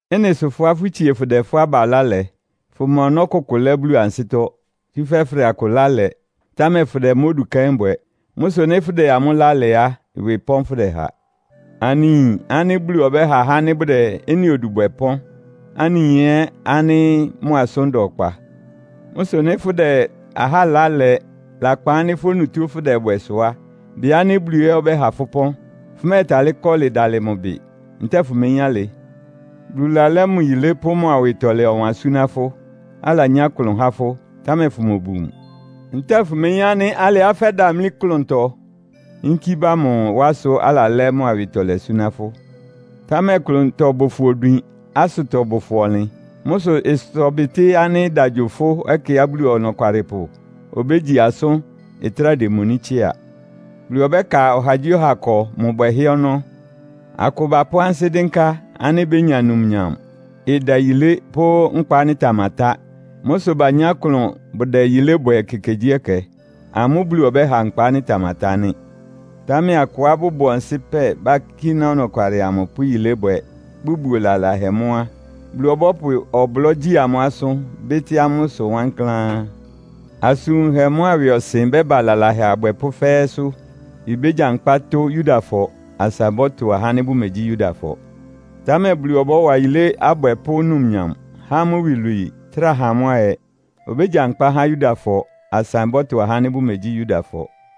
Ɩ́nɩ sʋ fʋ́á fʋtsie fʋdɛ fʋ́ aba ɩlá lɛ, fʋma ɔnɔ́ kʋkʋ lɛ́ Bulu ansɩ́tɔ́. Tsúfɛ́ fʋdɛ akʋ ɩlá lɛ, támɛ fʋdɛ mʋ́ odu kɛ́n bwɛ. Mʋ́ sʋ nɩ́ fʋdɛ amʋ́ ɩlá lɛ á, ɩwɩ pɔ́n fʋ́dɛha. Anɩyin ánɩ́ Bulu ɔbɛ́ha ahá ánɩ́ bʋdɛ ɩ́nɩ odu bwɛ ɩpɔ́n. Anɩyin ɛ́ ánɩ́ mʋ asʋ́n da ɔkpa. Mʋ́ sʋ nɩ́ fʋ́dɛ ahá ɩlá lɛ lakpan ánɩ́ fʋ́ onutó fʋ́dɛbwɛ sʋ á, bɩ ánɩ́ Bulu ɛ́ ɔbɛ́ha fʋ́ ɩpɔ́n. Fʋmɛ́ɛtalɩ́ kɔlɩ dalɩ mʋ ɩbɩ. Ntɛ́ɛ fʋmeyín alɩ? Bulu lalɛ́ mʋ yilé pʋ́ mʋ awɩtɔlɛ ɔwan súná fʋ́, alanyá klʋn há fʋ́, támɛ fʋmobu mʋ. Ntɛ́ɛ fʋmeyín ánɩ́ alɩá fɛ́damlí klʋntɔ yínkí ba mʋ wá sʋ alalɛ́ mʋ awɩtɔlɛ súná fʋ́? Támɛ klʋntɔ bʋ fʋ odwin, asʋtɔ bʋ fʋ ɔnlɩn. Mʋ́ sʋ ɩsʋtɔbɩtɩ́ ánɩ́ ɩda gyo fʋ́ ɛkɛá Bulu Ɔnɔkwalɩpʋ obégyi asʋ́n ɩtráa démoní tsɩ́a. Bulu ɔbɛ́ka ɔhagyíɔha ɩkɔ mʋ bwɛhɛ́ ɔnɔ́. Akʋ bapʋ́ ansɩ́ dɩ́nká ánɩ́ bénya numnyam, ɩdayilé pʋ́ nkpa ánɩ́ ɩtamatá. Mʋ́ sʋ banyá klʋn bʋdɛ yilé bwɛ ekekegyíɛkɛ. Amʋ́ Bulu ɔbɛ́ha nkpa ánɩ́ ɩtamatá nɩ́. Támɛ akʋá bʋbʋ ɔnsɩ́pɛ, bakíná ɔnɔkwalɩ amʋ pʋ́ yilébwɛ, bʋbuo lalahɛ mʋ́ á, Bulu ɔbɔ́pʋ ɔblɔ́ gyi amʋ́ asʋ́n, bɩ́tɩ́ amʋ́ ɩsʋ wankláán. Asʋn wunhɛ mʋ́a ɩwɩɔsɩn bɛ́ba lalahɛ abwɛpʋ́ fɛ́ɛ́sʋ́. Ibégyankpá tʋ́ Yudafɔ, asa ɩbɔ́tʋ ahá ánɩ́ bʋmegyí Yudafɔ. Támɛ Bulu ɔbɔ́wa yilé abwɛpʋ́ numnyam, há amʋ́ iwilwii, trá ha amʋ́ ayɛ. Obégyankpá há Yudafɔ, asa ɩbɔ́tʋ ahá ánɩ́ bʋmegyí Yudafɔ.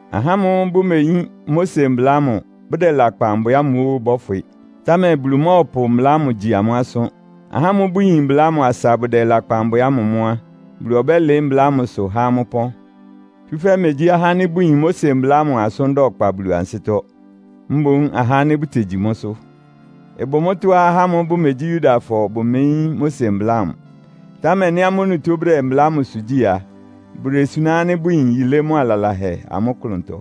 Ahá ámʋ́ʋ́ bʋmeyín Mose Mbla ámʋ, bʋdɛ lakpan bwɛ ámʋ óó bɔ́fwɩ. Támɛ Bulu mɔ́ɔpʋ mbla ámʋ gyi amʋ́ asʋ́n. Ahá ámʋ́ʋ́ bʋyin mbla ámʋ asa bʋdɛ lakpan bwɛ ámʋ mʋ́ á, Bulu ɔbɛ́lɩɩ́ mbla ámʋsʋ há amʋ́ ɩpɔ́n. Tsúfɛ́ megyí ahá ánɩ́ bʋyin Mose Mbla ámʋ asʋ́n da ɔkpa Bulu ansɩ́tɔ́. Mboún ahá ánɩ́ bʋtegyi mʋ́sʋ́. Ɩbʋ mʋ́tɔ́á ahá ámʋ́ʋ́ bʋmegyí Yudafɔ bʋmeyín Mose Mbla ámʋ. Támɛ nɩ́ amʋ́ onutó bʋdɛ mbla ámʋsʋ gyí a, bʋdesuná ánɩ́ bʋyin yilé mʋ́a lalahɛ amʋ́ klʋntɔ.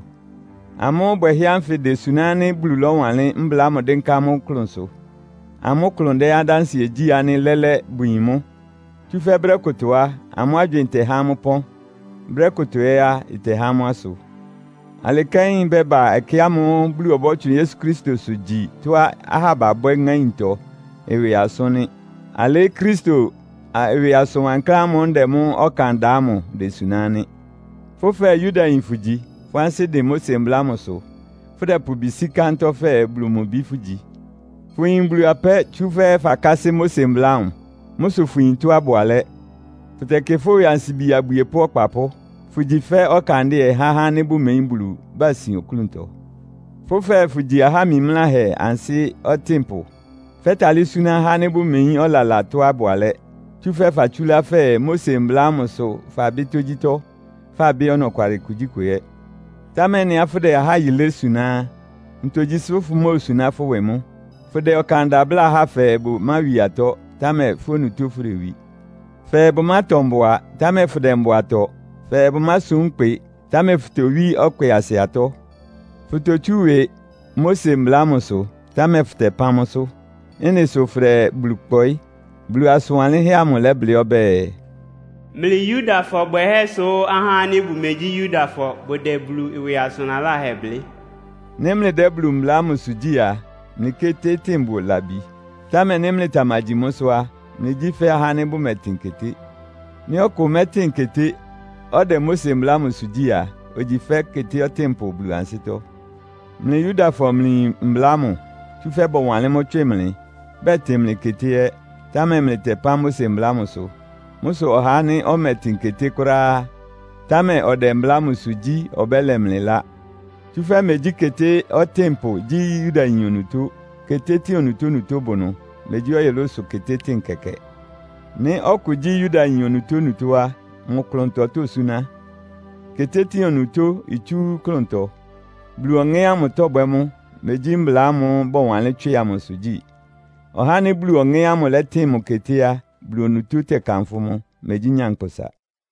Amʋ́ bwɛhɛ́ ánfɩ desuná ánɩ́ Bulu lɔ́wanlɩ́n mbla ámʋ dɩ́nká amʋ́ klʋnsʋ. Amʋ́ klʋn dɛ adánsɩɛ gyí ánɩ́ lɛ́lɛ́ bʋyin mʋ́. Tsúfɛ́ brɛ́ kʋtɔ á, amʋ́ agywɩɩn tɛhá amʋ́ ɩpɔ́n, brɛ́ kʋtɔ ɛ́ á, ɩtɛhá amʋ́ asʋ. Alɩ kɛ́n ɩbɛ́ba ɛkɛ ámʋ́ʋ́ Bulu ɔbɔ́tsʋn Yesu Kristosʋ gyi tɔ́á ahá babwɛ́ ŋáintɔ ɩwɩ asʋ́n nɩ́. Alɩ́ Kristo ɩwɩ asʋn wankláán ámʋ́ʋ́ ndɛ mʋ́ ɔkan da ámʋ idesuná nɩ́. Fʋ́ fɛɛ Yudayin fʋgyi, fʋ́ ansɩ́ dɩn Mose Mbla ámʋsʋ, fʋ́dɛpʋ ɩbɩ sí kántɔ́ fɛɛ Bulu mʋ bi fʋ́gyi. Fʋyin Bulu apɛ́, tsúfɛ́ fakásɩ́ Mose Mbla ámʋ. Mʋ́ sʋ fʋyin tɔ́á ɩbʋ alɛ́. Fʋtɛkɩ fʋ́ ɩwɩ ansibi abwiepʋ́ ɔkpapʋ́, fʋ́gyi fɛ́ ɔkandɩ́ɛ há ahá ánɩ́ bʋmeyín Bulu, basin oklúntɔ. Fʋ́ fɛɛ fʋgyi aha mimláhɛ ansɩ́ ɔtɩ́npʋ. Fɛ́talɩ́ súná ahá ánɩ́ bʋmeyín ɔlala tɔ́á ɩbʋ alɛ́. Tsúfɛ́ fatsúlá fɛɛ Mose Mbla ámʋ sʋ fabɩ́ tógyítɔ́, fabɩ́ ɔnɔkwalɩ kugyíkʋ ɛ́. Támɛ ɩ́nɩá fʋ́dɛ ahá yilé suná á, ntogyi sʋ fʋmóosuná fʋ́ ɩwɩ mʋ́? Fʋdɛ ɔkan da bláa ahá fɛɛ bʋmáwi atɔ́, támɛ fʋ́ onutó fʋdewi? Fɛɛ bʋmátɔ mbʋa, támɛ fʋdɛ mbʋa tɔ? Fɛɛ bʋmásum ɩkpɩ, támɛ fʋtowí ɔkpɩasɩ atɔ́. Fʋtotsú ɩwɩ Mose Mbla ámʋ sʋ, támɛ fʋtɛpán mʋ́sʋ́. Ɩ́nɩ sʋ fʋdɛ Bulu kpɔɩ́. Bulu asʋn wanlɩ́nhɛ́ amʋ lɛ́blɩ́ ɔbɛ́ɛ, “Mlɩ Yudafɔ bwɛhɛ́ sʋ ahá ánɩ́ bʋmegyí Yudafɔ bʋdɛ Bulu ɩwɩ asʋn laláhɛ blɩ́.” Nɩ́ mlɩdɛ́ Bulu mbla ámʋsʋ gyí á, mlɩ ketétɩ́ɩn bʋ labi. Támɛ nɩ́ mlɩtamagyi mʋ́sʋ́ á, mlɩgyí fɛ́ ahá ánɩ́ bʋmɛtɩn keté. Nɩ́ ɔkʋ mɛ́tɩn keté, ɔdɛ Mose Mbla ámʋsʋ gyí a, ogyi fɛ́ keté ɔtɩ́npʋ Bulu ansɩ́tɔ́. Mlɩ Yudafɔ mlɩyin mbla ámʋ, tsúfɛ́ bɔwanlɩ́n mʋ́ tswɩ mlɩ, bɛtɩn mlɩ keté ɛ́, támɛ mlɩtɛpán Mose Mbla ámʋsʋ. Mʋ́ sʋ ɔhá ánɩ́ ɔmɛtɩn keté kʋ́ráá, támɛ ɔdɛ mbla ámʋsʋ gyí ɔbɛ́lɛ mlɩ ɩlá. Tsúfɛ́ megyí keté ɔtɩ́npʋ gyí Yudayin onutó. Ketétɩ́ɩn onutónutó bʋ ɩnʋ. Megyí ɔyʋlʋ́sʋ ketétɩ́ɩn kɛkɛ. Nɩ́ ɔkʋ gyí Yudayin onutónutó á, mʋ klʋntɔ tósúná. Ketétɩ́ɩn onutó itsú klʋntɔ. Bulu Ɔŋɛ́ ámʋ tɔ́bwɛ́ mʋ́, megyí mbla ámʋ́ʋ́ bɔwanlɩ́n tswɩ amʋsʋ gyí. Ɔhá ánɩ́ Bulu Ɔŋɛ́ ámʋ ɩlɛtɩn mʋ keté á, Bulu onutó tɛ́kánfʋ́ mʋ, megyí nyankpʋsa.